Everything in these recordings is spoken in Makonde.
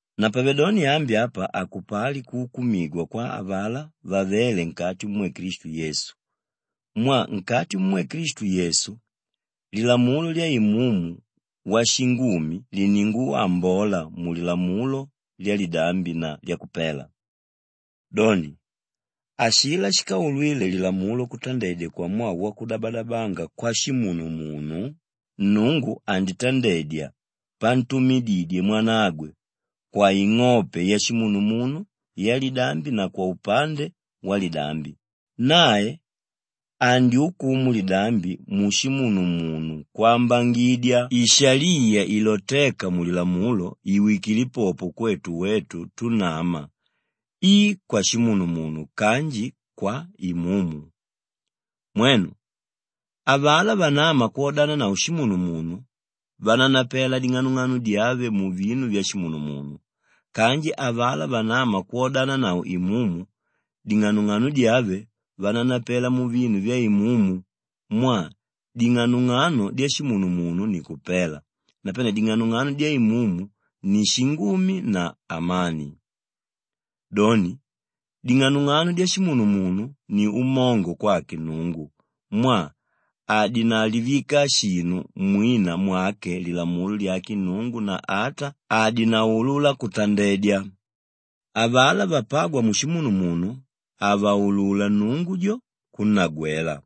Napavedoni ambi apa hakupali kuukumigwa kwa avalá vavéle nkati mumwe Klistu Yesu mwaa nkati mumwe Klistu Yesu, lilamulo lya Imumu washingumi liningwambola mulilamulo lyalidambi na lyakupela. Doni, ashilá shíkaulwile lilamulo kutandedya kwamwaa wakudabadabanga kwashimunumunu, Nnungu anditandedya pantumididye Mwanagwe kwaing'ope yashimunumunu yalidambi na kwaupande walidambi, nae andyukumu lidambi mushimunumunu kwambangidya ishaliya ilotéka mulilamulo iwikile popo kwetu wetu túnama i kwashimunumunu kanji kwa Imumu. Mwenu, avalá vanáma kwodananavo shimunumunu, vananapela ding'anong'ano dyave muvinu vyashimunumunu kanji avalá vanáma kwodananavo Imumu, ding'anong'ano dyave vananapela muvinu vya Imumu mwaa ding'anong'ano dyashimunumunu ni kupela napane ding'anong'ano dya Imumu ni shingumi na amani. Doni, ding'anong'ano dyashimunumunu ni umongo kwake Nnungu mwaa hadinalivika shinu mwina mwake lilamulo lyake Nnungu na ata hadinaulula kutandedya. Avalá vapágwa mushimunumunu havaulula Nnungu jo, kunnagwela.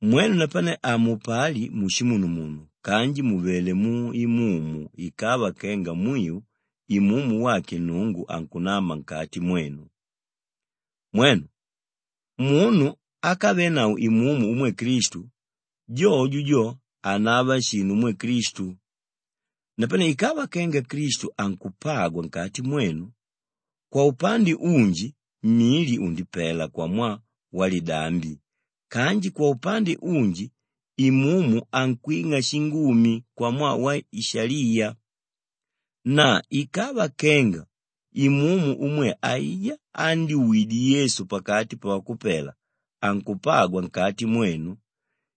Mwenu napane hamupali mushimunumunu kanji muvelé mu Imumu ikava kenga mwiu Imumu wake Nnungu ankunama nkati mwenu. Mwenu, munu ákavenavo Imumu umwe Klistu, jojo jo hanava shinu umwe Klistu. Napane ikava kenga Klistu ankupagwa nkati mwenu, kwaupande unji mili undipela kwamwaa walidambi kanji kwaupande unji Imumu ankwing'a shingumi kwamwaa waishaliya. Na ikava kenga Imumu umwe aijá ándyuwidye Yesu pakati pavakupela ankupagwa nkati mwenu,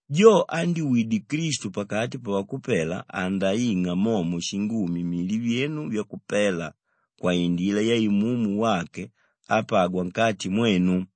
jo ándyuwidye Klistu pakati pavakupela andaing'a momo shingumi mili vyenu vyakupela kwaindila ya Imumu wake ápagwa nkati mwenu.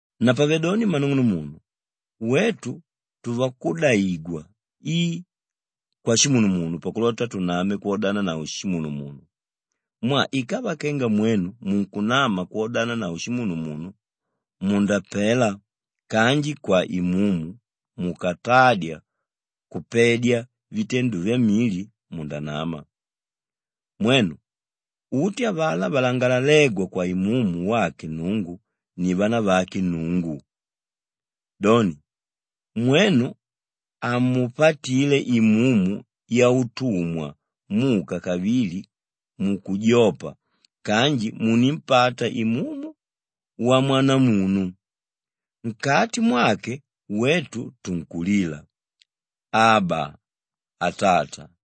Napavedoni mmanung'unumunu wetu tuvakudaigwa i kwashimunumunu pakulota tuname twodananavo shimunumunu mwaa ikava kenga mwenu munkunama kwodananavo shimunumunu, mundapela kanji kwa Imumu mukatadya kupedya vitendo vyamili, mundanama. Mwenu, uti avalá valangalalégwa kwa Imumu wake Nnungu ni vanavake Nnungu. Doni, mwenu hamupatile imumu yautumwa muka kavili mukujopa kanji munimpata Imumu wamwanamunu; nkati mwake wetu tunkulila, “Aba, Atata.”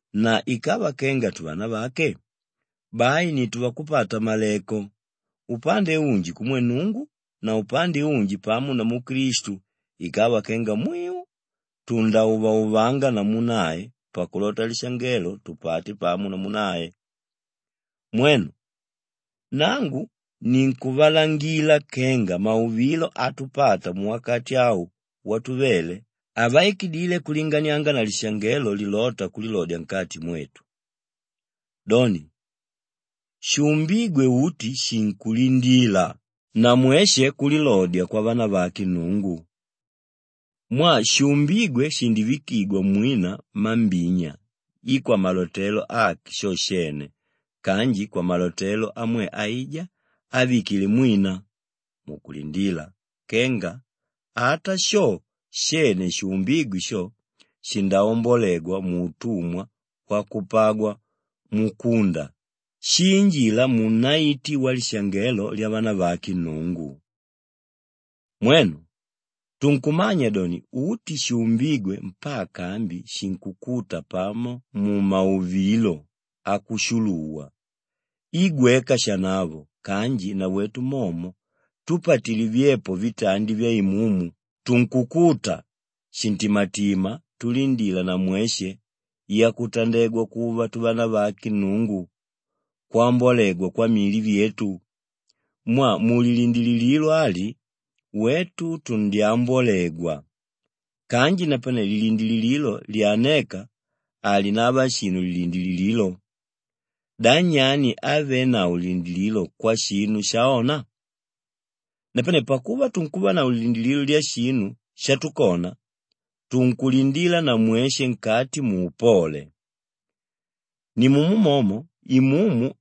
na ikava kenga tuvanavake, bai ni tuvakupata-maleko, upande unji kumwe Nnungu na upande unji pamo namu Klistu ikava kenga mwiu tundáuvauvanga namu nae pakulota lishangelo tupate pamo namu nae. Mwenu, nangu ninkuvalangila kenga mauvilo átupata muwakati au watuvele, havaikidile kulinganianga na lishangelo lilóta kulilodya nkati mwetu. Doni, shuumbígwe uti shinkulindila na mweshe kulilodya kwavanavake Nnungu. Mwaa shuumbígwe shindivikigwa mwina mambinya i kwamalotelo ake sho shene kanji kwamalotelo amwe aijá ávikile mwina, mukulindila kenga ata sho shene shuumbígwe sho, shindaombolegwa muutumwa wakupagwa mukunda shiinjila muunaiti walishangelo lyavanavake Nnungu. Mwenu, tunkumanya doni uti shuumbígwe mpaka ambi shinkukuta pamo mumauvilo akushuluwa i gweka shanavo kanji nawetu momo túpatile vyepo vitandi vya Imumu, tunkukuta shintimatima tulindila na mweshe yakutandegwa kuva tuvanavake Nnungu, kwambolegwa kwamili vyetu. Mwaa mulilindilililo ali wetu tundyambolegwa. Kanji napane lilindilililo lyanéka, halinava shinu lilindilililo. Da nyani ávenavo lilindilililo kwashinu shaona? Napane pakuva tunkuvanavo lilindilililo lyashinu shatukona, tunkulindila na mweshe nkati muupole. Nimumo momo Imumu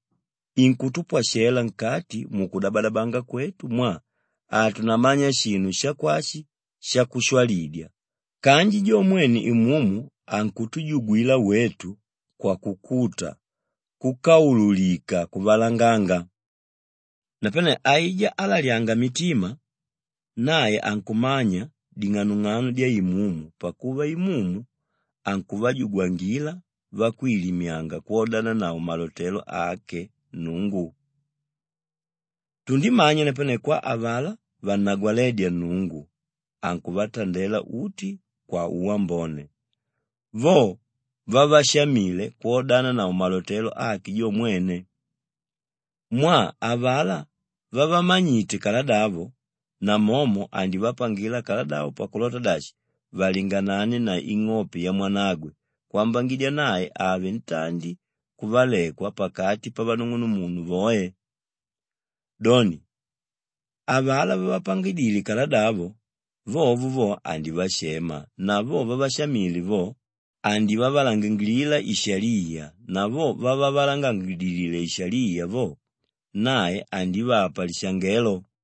inkutupwashela nkati mukudabadabanga kwetu mwaa hatunamanya shinu shakwashi shakushwalidya kanji jo mwene Imumu ankutujugwila wetu kwakukuta kúkaululika kuvalanganga. Napane aijá álalyanga mitima, nae ankumanya ding'anong'ano dya Imumu pakuva Imumu ankuvajugwangila vakwilimyanga kwodananavo malotelo ake Nnungu. Tundimanya napane kwa avalá vannagwalédya Nnungu ankuvatandela uti kwauwambone, vo vávashamile kwodananavo malotelo ake jo mwene. Mwaa avalá vávamanyite kaladavo, namomo andivapangila kaladavo pakulota dashi valinganane na ing'ope ya Mwanagwe kwambangidya nae ave ntandi kuvalekwa pakati pavanung'unumunu voe. Doni, avalá vávapangidile kaladavo, vovo vo andivashema na vo vávashamile vo, andivavalangilila ishaliya na vo vávavalangangilidile ishaliya vo, nae andivapa lishangelo.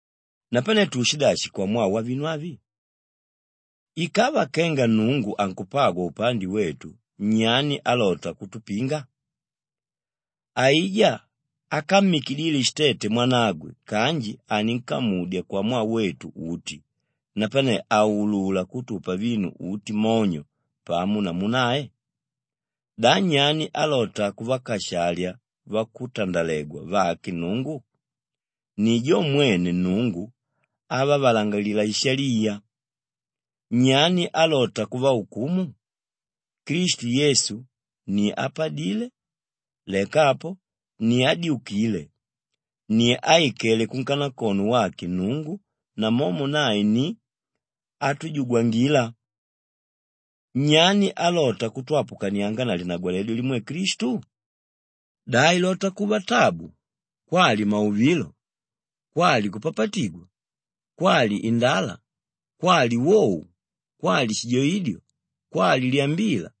Napane tuushidashi kwamwaa wavinu avi? Ikava kenga Nnungu ankupagwa upande wetu, nyani álota kutupinga? Aijá ákammikidile shitete Mwanagwe kanji aninkamudya kwamwaa wetu uti, napane haulula kutupa vinu uti monyo pamo namu nae? Da nyani álota kuvakashalya vakutandalegwa vake Nnungu? Ni jo mwene Nnungu ávavalangilila ishaliya. Nyani álota kuvaukumu? Klistu Yesu ni ápadile, leka apo ni ádyukile, ni áikele kunkanakono wake Nnungu namomo nae ni átujugwangila. Nyani álota kutwapukanianga na linagwaledyo limwe Klistu? Da ilota kuva tabu, kwali mauvilo, kwali kupapatigwa, kwali indala, kwali wou, kwali shijoidyo, kwali lyambila?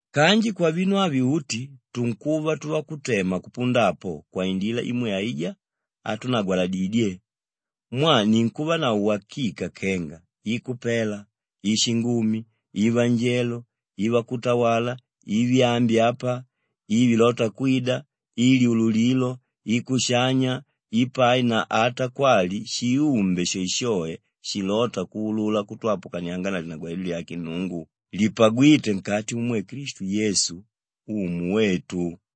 Kanji kwavinu avi uti tunkuva tuvakutema kupunda apo kwaindila imwe aijá átunagwaladidye. Mwaa ninkuvanavo wakika kenga i kupela, i shingumi, i vanjelo, i vakutawala, i vyaambi apa, i vilóta kwida, i lyululilo, i kushanya, i pai na ata kwali shiumbi shoeshoe shilóta kuulula kutwapukanianga na linagwaledyo lyake Nnungu lipagwíte nkati mumwe Klistu Yesu, Umu wetu.